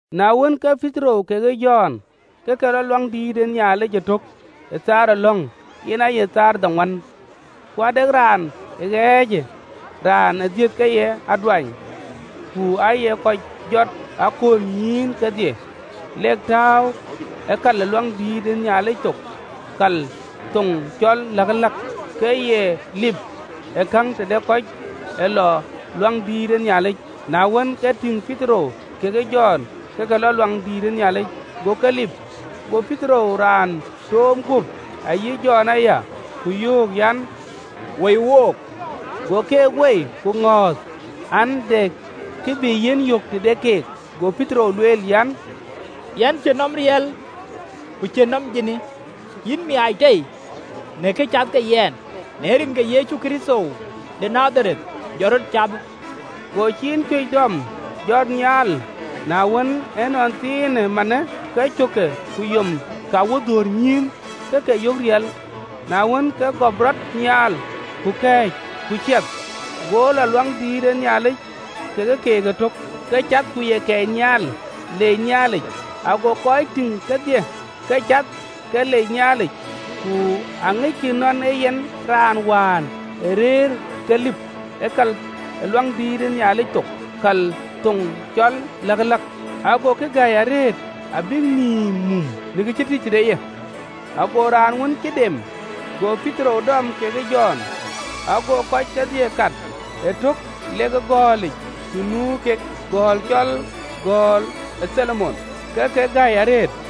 Na wën, ke Petero kekë Jɔn ke ke lɔ ë Luaŋdïtic ëtök ë thaar ë lɔ̈ŋ, yen aye thaar ë dhoŋuan. Ku ade raan ëtɛ̈ɛ̈n, raan ë dhiëth ke ye aduany, ku aaye kɔc jɔt e aköölnyïïn kedhie lek tääu ë kal ë Luaŋdït thok, kal thoŋ cɔl Läkëläk, ke ye lip ë käŋ tëde kɔc ee lɔ Luaŋdït ë Nhialic. Na wën, ke tïŋ Petero kekë Jɔn ë ke lɔ luaŋdït ë Nhialic, go ke lip. Go Petero raan toom guöp, ayï Jɔn aya, ku yöök an, “Woi wook!” Go keek woi, ke ŋɔ̈th an, de kë bï yiɛ̈n yök tëde keek. Go Petero lueel an, “Yɛn cïn nɔm ateek ku ciën nɔm adhääp, yïn miaac tei në kë cath ke yɛn: në rin ke Yecu Kërtho de Nadhareth, jɔt rɔt cathë!” Go ciin cuëc dɔm, jɔt nhial: na wën, ënɔnthiin manë ke cökke ku yom ke awodhoor nyïïn ke ke yök riɛl. Na wën, ke gɔp rɔt nhial, ku kɛ̈ɛ̈c, ku ciɛth, go lɔ ë Luaŋdïtic ke keek ëtök, ke cath ku ye kɛɛc nhial, leec Nhialic. Ago kɔc tïŋ kedhie ke cath ke lec Nhialic: ku aŋickï nɔn ee yen raan wään ë rëër ke lip ë kal ë luaŋdïït ë Nhialic thok, kal thoŋ cɔl Läkëläk: agokï gäi arëët abïk nïïm mum në kë cï tïc tëde ye. Ago raan wën cï dem go Petero dɔm kekë Jɔn, ago kɔc kedhie kat ëtök lek ë gɔ̈ɔ̈lic të nu kek, gɔ̈ɔ̈l cɔl Göl ë Tholomon, ke ke gäi arëët.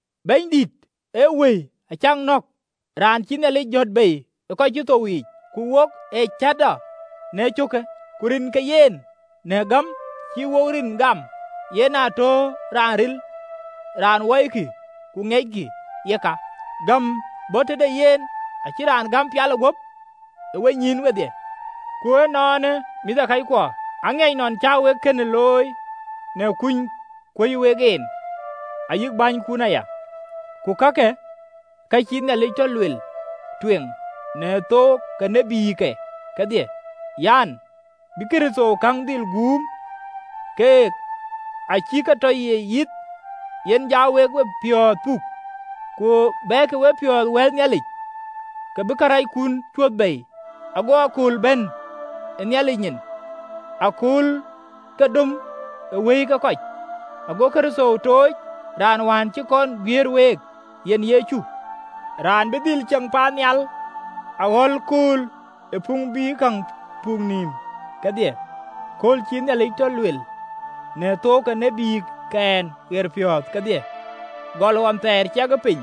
Bɛ̈nydït ë Wëi acäk nɔ̈k, raan cïï Nhialic jɔ̈t bei ë kɔc cï thou yiic, ku wok ee cäätɔɔ në cöökë. Ku rin ke yen, në gäm cï wo rinke gam, yen aa tɔ raanë ril, raan wɔikï ku ŋiɛckï: yeka, gäm bɔ̈ tëde yen acï raanë gäm guöp cï dikëdik ë wenyïïn wedhie. “Ku ënɔɔnë, mïthëkɔckuɔ, aŋiɛc nɔn cä wek kënë looi në kuny kuöc wek en, ayï bänykun aya. Ku kakë, ka cïï Nhialic tɔ luel tueŋ në thook ke tïtke kedhie an, bï Kërtho käŋ dhil guum, kek acï ke tɔ ye yith. Yen ja wek wepiɔ̈ɔ̈th puk, ku bɛkï wepiɔ̈ɔ̈th wɛ̈l Nhialic, ke bï karɛckun cuöth bei, ago akööl bɛ̈n ë Nhialic nyin akööl ke döm ë wëi ke kɔc, ago Kërtho tooc, raan wään cï kɔn guiëër week, yen Yecu: raan bï dhil ceŋ paannhial aɣɔ̈l kööl ë puŋ bï käŋ puk nïïm kedhie, kööl cïï Nhialic tɔ luel në thook ke tïtkɛn ɣeriic kedhie, gɔl ɣɔn thɛɛr ciɛkë piny.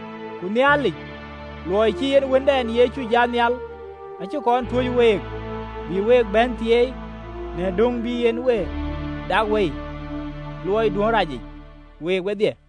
Ku Nhialic, luɔi cï en Wëndɛn Yecu jat nhial, acï kɔn tuöc week, bï week bɛ̈n thieei, në döŋ bï en we dak wei ë luɔiduön racic, week wedhie.”